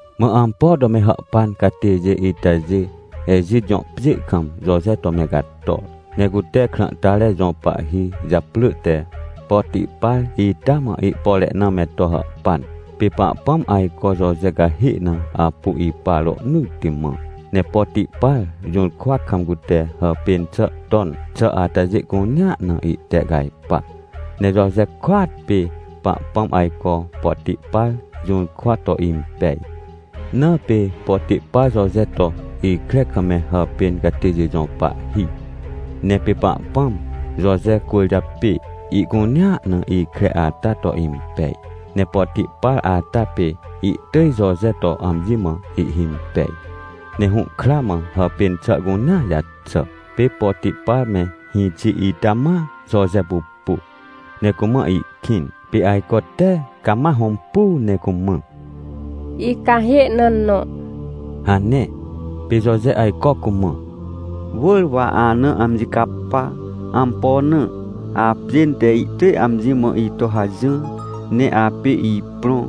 Mã ampo to me hàhpan catêjê itajê Ejit jõ pjê kam Joje to me cator. Ne cute krãhtare jõ pahhi japrỳ te Potipar ita mã ihpore na me to hàhpan. Pê Pahpãm ajco Joje cahê na apu ipa rohnỳtti mã. Ne Potipar jũrkwa kam cute hàpên xà ton xà atajê cunea na ihtehcajpa, ne Joje kôat pê Pahpãm ajco Potipar jũrkwa to impej. Na pê Potipar Joje to ikre kam me hàpên catêjê jõ pahhi. Ne pê Pahpãm, Joje cwỳrjapê, ihcunea na ikre ata to impej. Ne Potipar ata pê ihtỳj Joje to amji mã ihhimpej, ne hũhkra mã hàpên xà cunea jaxà. Pê Potipar me hĩxi ita ma Joje pupu, ne cumã ihkĩn, pê ajco te cama hõmpuu ne cumã: — Icahê na nõ — hane. Pê Joje ajco cumã: — Wỳr wa ana amji capa. Ampo na? Apjên te ihtỳj amji mã ito hajỹr, ne apê ihprõ.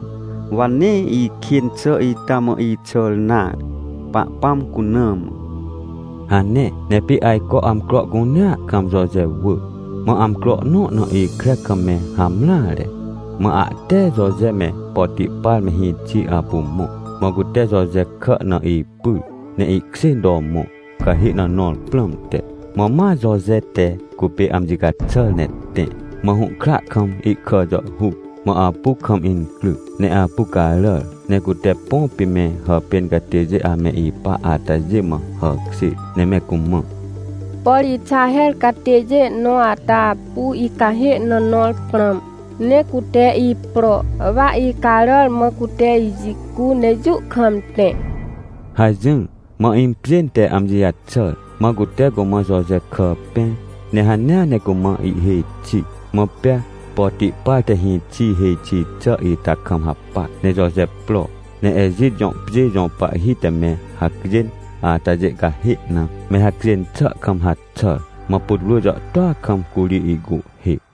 Wa nee ikên xà ita mã ixàr nare, Pahpãm cuna mã — hane. Ne pê ajco amcro cunea kam Joje wỳ. Mã amcro nõ na ikre kam me hamreare, mã ahte Joje me Potipar me hĩxi apu mõ. Mã cute Joje kà na ipyr ne ihkjên to mõ, cahê na nõr prãmte. Mã ma Joje te cupê amji caxàr ne tẽ, mã hũhkra kam ihkà jàhhuc. Mã apu kam incryc ne apu caràr, ne cute põ pê me hàpên catêjê ame ipa atajê mã hàkjêr ne me cumã: — Por Ixaher catêjê nõ ata apu icahê na nõr prãm, ne cute ipro, wa icaràr mã cute ijicu ne jũ kam tẽ — hajỹr. Mã impjên te amji jaxàr, mã cute cumã Joje kà pẽr ne hanea ne cumã ihhêj xi. Mã pea Potipar te hĩxi hêj xi xà ita kam hapac, ne Joje pro, ne Ejit jõ pjê jõ pahhi te me hacjên atajê cahê na, me hacjên xà kam haxàr. Mã putwrỳ jàhtôa kam curi ihcuhhê.